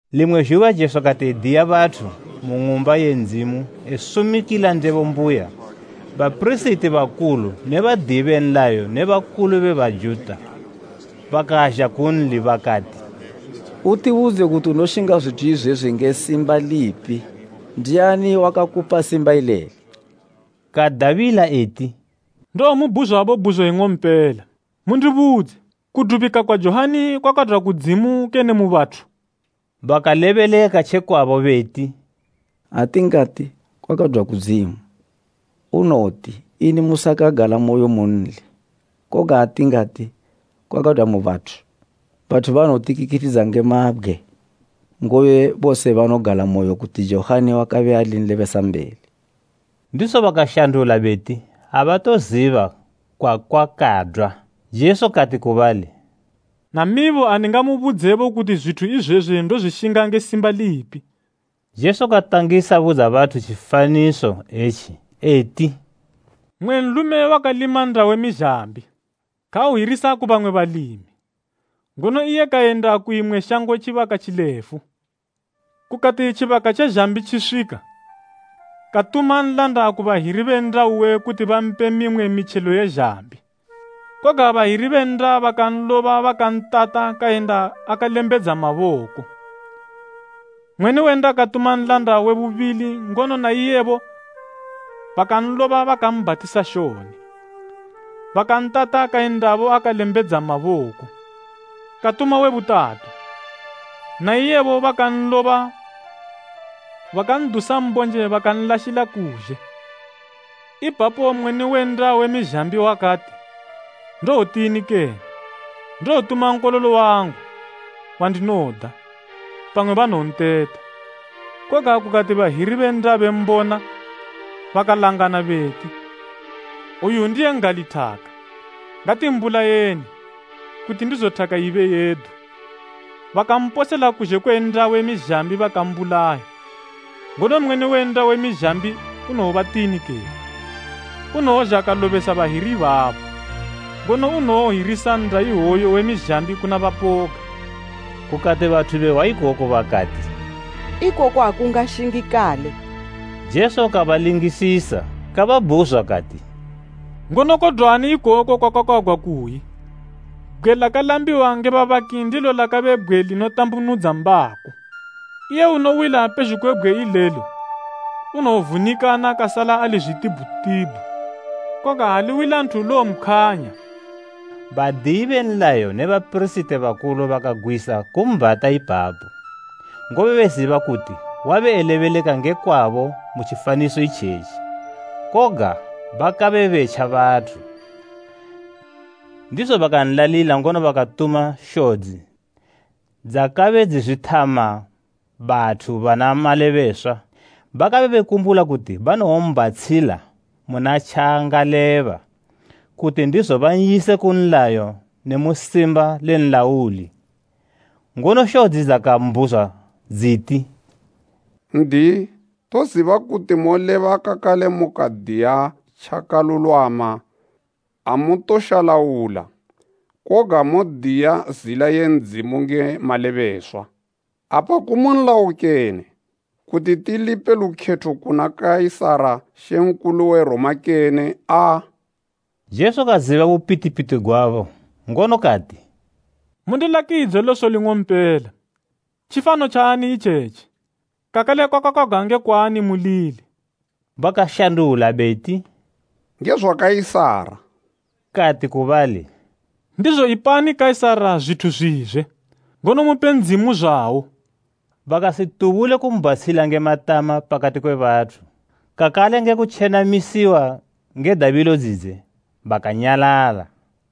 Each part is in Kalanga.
Limwe zhuba Jesu kati ediya bathu mu Ng'umba ye Ndzimu esumikila ndebo mbuya, bapirisiti bakulu ne badiyi be nlayo ne bakulu be Bajuta bakazha kunli, bakati, “Utibudze kuti unoshinga zwithu izwezwi nge simba lipi ndiani wakakupa simba ileli?” Kadabila eti, “Ndowomubhuzwabo bhuzo ing'ompela. Mundibudze, kudubika kwa Johani kwakadwa kudzimu kene mu bathu?” Bakalebeleka tje kwabo beti, “Ha tingati, ‘Kwakadwa kudzimu,’ unowoti, ‘Ini musakan'galamoyo munli?’ Koga ha tingati, ‘Kwakadwa mu bathu,’ bathu banowotikikithidza nge mabgwe, ngobe bose banogalamoyo kuti Johani wakabe ali nlebesambeli.” Ndizo bakashandula beti, abatoziba kwakwakadwa. Jesu kati ku bali, “Namibo andingamubudze kuti zwithu izwezwi ndozwishinga nge simba lipi.” Jesu katangisa budza bathu tjifaniso etji, eti, “Mmwe nlume wakalima nnda we mizhambi. Kauhirisa ku bamwe balimi, ngono iye kayenda ku imwe shango tjibaka tjilefu. Kukati tjibaka tje zhambi tjiswika, katuma nlanda ku bahiri be nnda uwe kuti bampe mimwe mitjelo ye zhambi. Koga bahiri be nnda bakanloba bakantata kayenda akalembedza maboko. Mweni we nnda katuma nlanda we bubili ngono na iyebo bakanloba bakambhatisa shoni, bakantata kayendabo akalembedza maboko. Katuma we butatu, na iyebo bakanloba bakandusa mbonje bakanlashila kuzhe. Ipapo mweni we nnda we mizhambi wakati, ‘Ndowotini kene? Ndowotuma nkololo wangu, wandinoda, pamwe banowonteta.’ Koga kukati bahiri be nnda bembona, bakalangana beti, ‘Oyu ndiye n'gali thaka. Ngatimbulayeni, kuti ndizo thaka ibe yedu!’ Bakamposela kuzhe kwe nnda we mizhambi bakambulaya. “Ngono mweni we nnda we mizhambi unowobatini kene? Unowozha kalobesa bahiri ibabo, ngono unowohirisa nnda iwoyo we mizhambi kuna bapoga.” Kukati bathu behwa ikoku bakati, “Ikoku akungashingikale!” Jesu kabalingisisa, kababhuzwa kati, “Ngono kodwani ikoku kwakakwagwa kuyi “ ‘Bgwe lakalambiwa nge babaki ndilo lakabe bgwe linotambunudza mbako?’ “Iye unowila pezhugwi kwe bgwe ilelo, unowovunikana kasala ali zwitibhutibhu, koga ha liwila nthu lowompkhwanya.” Badiyi be nlayo ne bapirisiti bakulu bakagwisa kumbhata ipapo, ngobe beziba kuti wabe elebeleka nge kwabo mu tjifaniso itjetji. Koga bakabe betja bathu. Ndizo bankanlalila ngono bakatuma shodzi dzakabe dzizwithama bathu bana malebeswa. Bakabe bekumbula kuti banowombhatshila muna tjaangaleba, kuti ndizo ban'yise ku nlayo ne mu simba le nlauli. Ngono shodzi dzakambhuzwa dziti, “N'diyi, toziba kuti moleba kakale mukadiya tjakalulwama amutoshalaula, koga modiya zila ye Ndzimu nge malebeswa. Apa kumu nlayo kene, kuti tilipe lukhetho kuna Kaisara Mambo we Roma kene aa?” Jesu kaziba bupitipiti gwabo ngono kati, “Mundilakidze loso ling'ompela. Tjifano tjaani itjetji, kakale kwakakwagwa nge kwaani mulili?” Bakashandula beti, “Nge zwa Kaisara.” Kati ku bali, “Ndizo ipani Kaisara zwithu zwizwe, ngono mupe Ndzimu zwawo.” Bakasitubule kumbhatshila nge matama pakati kwe bathu. Kakale nge kutjenamisiwa nge dabilo dzidze, bakanyalala.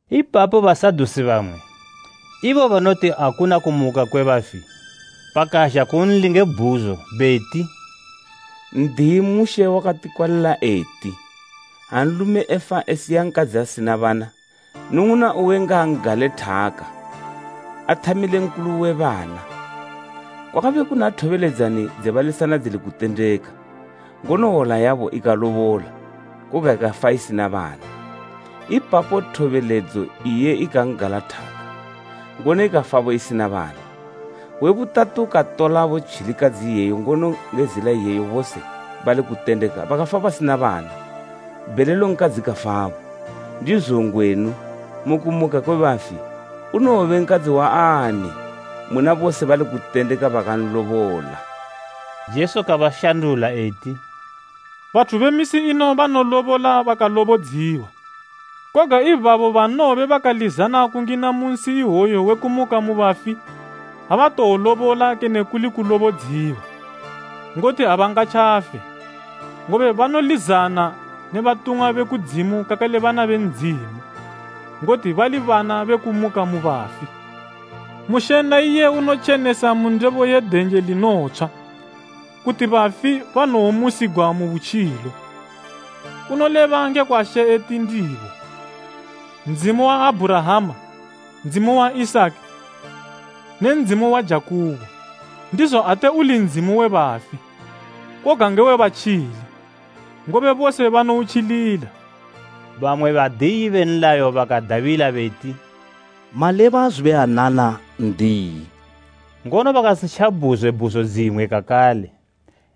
Ipapo Basadusi bamwe, ibo banoti akuna kumuka kwe bafi, bakazha kunli nge bhuzo, beti, “N'diyi, Mushe wakati kwalila eti, ‘Ha nlume efa esiya nkadzi asina bana, nnung'una uwe ngaan'gale thaka, athamile nkulu uwe bana.’ Kwakabe kuna thobeledzani dze balisana dzili kutendeka, ngono hwola yabo ikalobola, koga ikafa isina bana. Ipapo thobeledzo iye ikan'gala thaka, ngono ikafabo isina bana. We butatu katolabo tjilikadzi iyeyo ngono nge zila iyeyo, bose bali kutendeka bakafa basina bana. Bhelelo nkadzi kafabo. Ndizo ngwenu, mu kumuka kwe bafi, unowobe nkadzi waani muna bose bali kutendeka bakanlobola?” Jesu kabashandula eti, “Bathu be misi ino banolobola bakalobodziwa. Koga ibabo banowobe bakalizana kungina mu nsi ihwoyo we kumuka mu bafi, abatowolobola kene kuli kulobodziwa, Ngoti abangatjafe, ngobe banolizana ne batumwa be kudzimu kakale bana be Ndzimu, ngoti bali bana be kumuka mu bafi. Mushe na iye unotjenesa mu ndebo ye denje linotshwa, kuti bafi banowomusigwa mu butjilo. Unoleba ngekwa She eti ndibo, ‘Ndzimu wa Abhurahama, Ndzimu wa Isaki ne Ndzimu wa Jakubo.’ Ndizo ate uli Ndzimu we bafi, koga nge we batjili, ngobe bose banoutjilila.” Bamwe badiyi be nlayo bakadabila beti, “Maleba zubuyanana, n'diyi!” Ngono bakasitjabhuzwe bhuzo dzimwe kakale.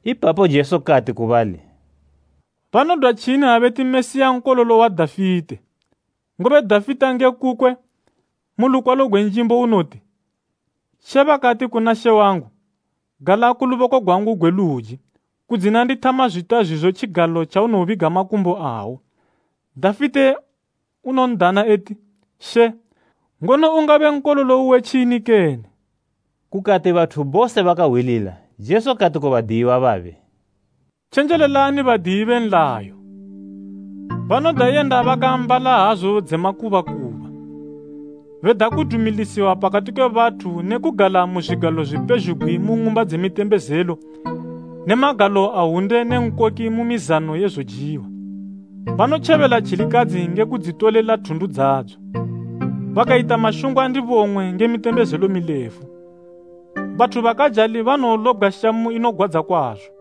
Ipapo Jesu kati ku bali, “Banodwatjini ha beti Mesiya nkololo wa Dafite? Ngobe Dafite nge kukwe mu lukwalo gwe Njimbo unoti, “ ‘She bakati kuna She wangu, Gala ku luboko gwangu gwe luji, kudzina ndithama zwita zwizo tjigalo tjaunobiga makumbo awo.’ “Dafite unondana eti, ‘She.’ Ngono ungabe nkololo uwe tjini kene?” Kukati bathu bose bakahwilila, Jesu kati ku badiyiwa babe, “Tjenjelelani badiyi be nlayo. Banoda yenda bakaambala hazu dze makubakuba, beda kudumiliswa pakati kwe bathu ne kugala mu zwigalo zwi pezhugwi mu ng'umba dze mitembezelo ne magalo a hwunde ne nkoki mu mizano ye zojiwa. Banotjebela tjilikadzi nge kudzitolela thundu dzadzo, bakayita mashungwa ndibong'we nge mitembezelo milefu. Bathu bakajali banowolobgwa shamu inogwadza kwazo.”